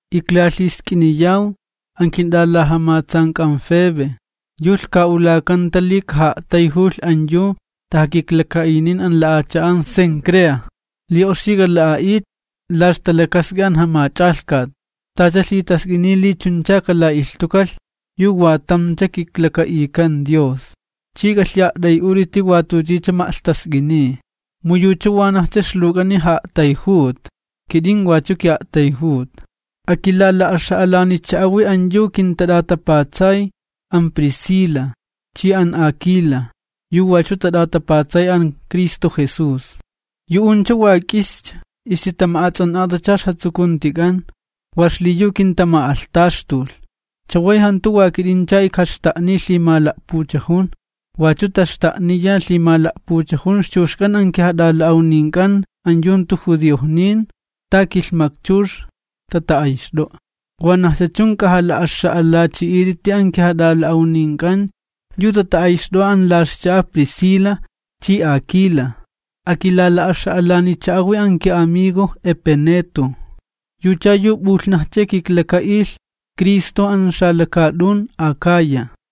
Iklalhisk'iniyaw an kint'alajamatsank'an Febe, yu lhka'ulakanta li kaja'a'tayjulh an yu tajakiklaka'inin an la'acha'an Cencrea li oxi k'ala'a'it, la ixtalakask'i an Jamach'alhkat, tacha lhitask'iniy li chuncha kalak'ilhtukalh yu wa tamcha kiklaka'ikan Dios. Chi k'alhi'a't'ay'ut'iti wa tuchicha ma'lhtask'iniy, mu yucha wanajcha ixluwk'ani ja'a'tayjuta, kit'in wachu ki'a'tayjuta. Akilala'axa'alanicha'awi an yu kintat'atapatsay an Priscila chi an Aquila, yu wachu tat'atapatsay an Cristo Jesús. Yu'uncha wa k'ischa ixtitama'ats'an'atacha ixjatsukuntik'an wa xliyu kintama'alhtaxtulh, chaway jantu wa kit'incha ijkaxta'niy lhimala'puchajun, wachu taxta'niya lhimala'puchajun ixchuxk'an an kijat'ala'awnink'an an yu jantu judiojnin ta kilhmakchux tata'ayxt'o'a. Wanajcha chun k'ajala'axa'alachi'it'iti an kijat'ala'awnink'an yu tata'ayxt'o'a an la ixcha'a Priscila chi Aquila. Akilala'axa'alanicha'awi an ki'amigo Epeneto, yucha yu p'ulhnajcha kiklaka'ilh Cristo an xalakaat'un Akaya.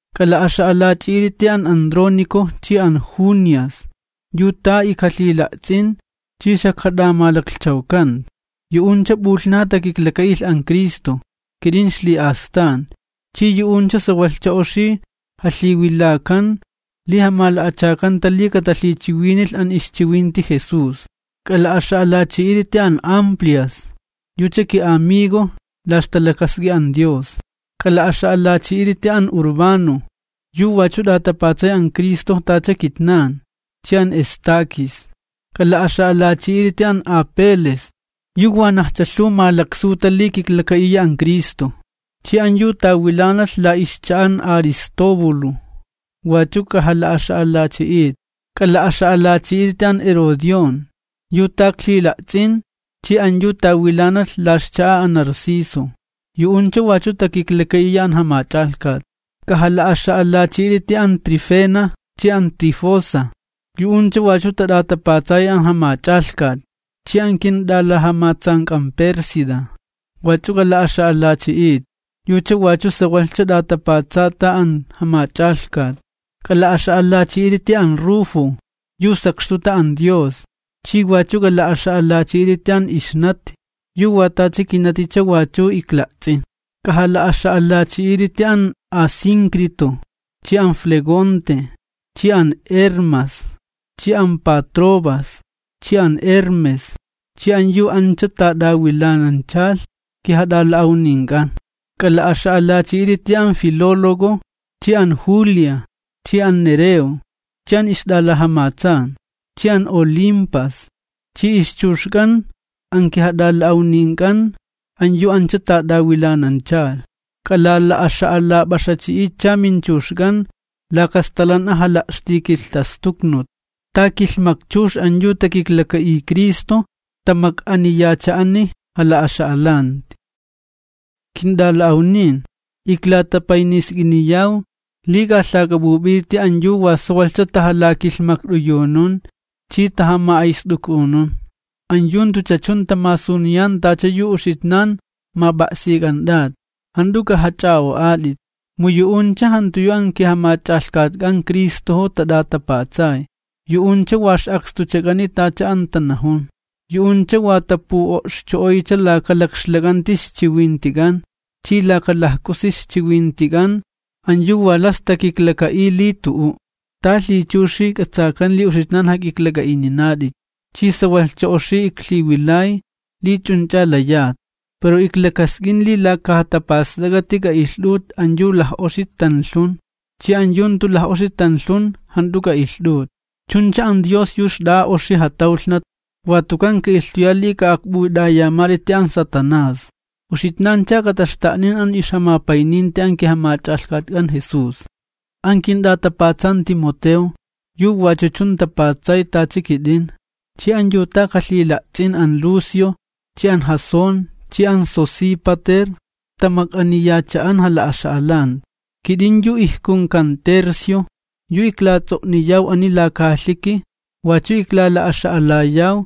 K'ajala'axa'alachi'it'iti an Andrónico chi an Junia, yu ta ijkalhila'ts'in chi xajkat'amalaklhchawkanta, yu'uncha p'ulhnaja takiklaka'ilh an Cristo kit'in ixli'astan, chi yu'uncha sawalhcha oxi jalhiwilakan li jamala'achakanta li katalhichiwinilh an ixchiwinti Jesús. K'ala'axa'alachi'it'iti an Amplias, yucha ki'amigo la ixtalakask'i an Dios. K'ala'axa'alachi'it'iti an Urbano, yu wachu t'atapatsay an Cristo tacha kitnan chi an Estaquis. K'ala'axa'alachi'it'iti an Apeles, yu wanajcha lhuw malaksuta li kiklaka'iya an Cristo, chi an yu tawilanalh la ixcha'a an Aristóbulo wachu k'ajala'axa'alachi'it. K'ala'axa'alachi'it'iti an Herodión yu ta iklhila'ts'in chi an yu tawilanalh la ixcha'a an Narciso, yu'uncha wachu takiklaka'iya an Jamach'alhkat. K'ajala'axa'alachi'i't'iti an Trifena chi an Trifosa, yu'uncha wachu tat'atapatsayi an Jamach'alhkat, chi an kint'alajamatsank'an Pérsida, wachu k'ala'axa'alachi'it, yucha wachu sawalhcha t'atapatsata an Jamach'alhkat. K'ala'axa'alachi'it'iti an Rufo, yu sakxtuta an Dios, chi wachu k'ala'axa'alachi'it'iti an ixnati yu wa tacha kinaticha wachu ikla'ts'in. K'ajala'axa'alachi'it'iti an Asíncrito chi an Flegonte chi an Hermas chi an Patrobas chi an Hermes chi an yu ancha tat'awilananchalh kijat'ala'awnink'an. K'ala'axa'alachi'it'iti an Filólogo chi an Julia chi an Nereo chi an ixt'alajamatsan, chi an Olimpas chi ixchuxk'an an kijat'ala'awnink'an an yu ancha tat'awilananchalh. K'alala'axa'alap'axachi'itcha minchuxk'an laka stalan'a jala'xtikilhtastuknut. Ta kilhmakchux an yu takiklaka'iy Cristo tamak'aniyacha'ani jala'axa'alanti. Kint'ala'awnin, iklatapaynisk'iniyaw li k'ajalhak'ap'up'it'iti an yu wa sawalhcha tajalakilhmakt'uyunun chi tajama'ayst'uk'unun, an yu jantucha chun tamasuniyan tacha yu uxitnan map'a'sik'ant'at. Jant'u k'ajach'a'o'at'it, mu yu'uncha jantu yu an kiJamach'alhkatk'an Cristojo tat'atapatsay, yu'uncha wa ix'akstuchak'ani tacha an tanajun, yu'uncha wa tapu'o'xcho'oycha laka lakxlak'anti ixchiwintik'an chi laka lajk'usi ixchiwintik'an an yu wa las takiklaka'iy li tu'u'. Ta lhichuxi k'atsakan li uxitnan jak'iklak'a'ininat'it, chi sawalhcha oxi iklhiwilay li ch'unch'a layat, pero iklakask'in li laka jatapast'ak'ati k'a'ilht'ut an yu laj'oxi tanlhun chi an yu jantu laj'oxi tanlhun jant'u k'a'ilht'ut, chuncha an Dios yu xt'a'a oxi jatawlhnat watukan ka'ilhtuya li k'a'akp'ut'ayamat'iti an Satanás. Uxitnancha kataxta'nin an ixjamapayninti an kiJamach'alhkatk'an Jesús. An kint'atapatsan Timoteo, yu wachu chun tapatsay tacha kit'in chi an yu ta ijkalhila'ts'in, an Lucio chi an Jasón chi an Sosípater tamak'aniyacha'an jala'axa'alanti. Kit'in yu ijkunkan Tercio, yu iklats'o'niyaw ani laka carta, wachu iklala'axa'alayaw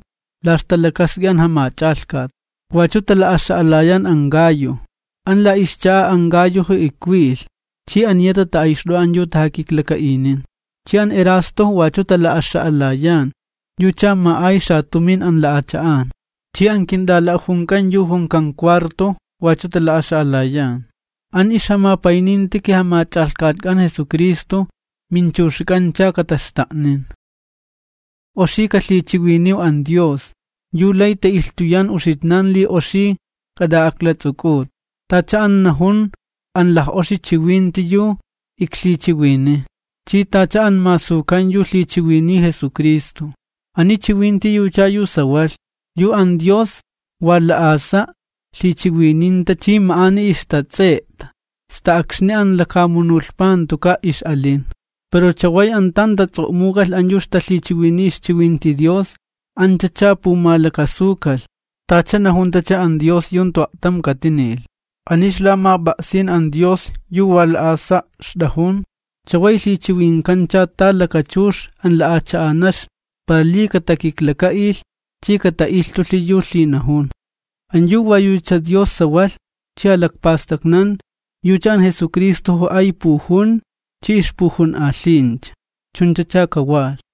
la ixtalakask'i an Jamach'alhkat. Wachu tala'axa'alayan an Gayo. An la ixcha'a an Gayojo ikwilh, chi aniya tata'ayxt'o'a an yu tajakikla'inin. Chi an Erasto wachu tala'axa'alayan, yucha ma'ay xatumin an la'acha'an, chi an kint'ala'ajunk'an yu junkan Cuarto wachu tala'axa'alayan. [ An ixjamapayninti kiJamach'alhkatk'an Jesucristo minchuxk'ancha kataxta'nin.] Oxi kalhichiwiniw an Dios, yu lay ta'ilhtuyan uxitnan li oxi k'at'a'aklats'uk'ut, tacha an najun an laj'oxi chiwinti yu iklhichiwiniy, chi tacha an masukan yu lhichiwiniy Jesucristo. Ani chiwinti yucha yu sawalh, yu an Dios wa la'asa' lhichiwininta chi ma'ani ixtats'e'ta sta akxni an lakamunulhpa jantuka' ix'alin. Pero chaway an tan tats'o'muk'alh an yu ixtalhichiwiniy ixchiwinti Dios, anchacha pumalakasukalh, tacha najuntacha an Dios yu jantu a'tam katinilh. Ani ixlamap'a'sin an Dios yu wa la'asa' ixt'ajun, chaway jalhixa'alakancha ta kilhmakchux an lapanakni para li katakiklaka'ilh chi kata'ilhtulhi yu lhinajun. An yu wa yucha Dios sawalh chi jalakpastaknan, yucha an Jesucristojo ay pujun chi ixpujun'alhincha. Chunchacha kawalh.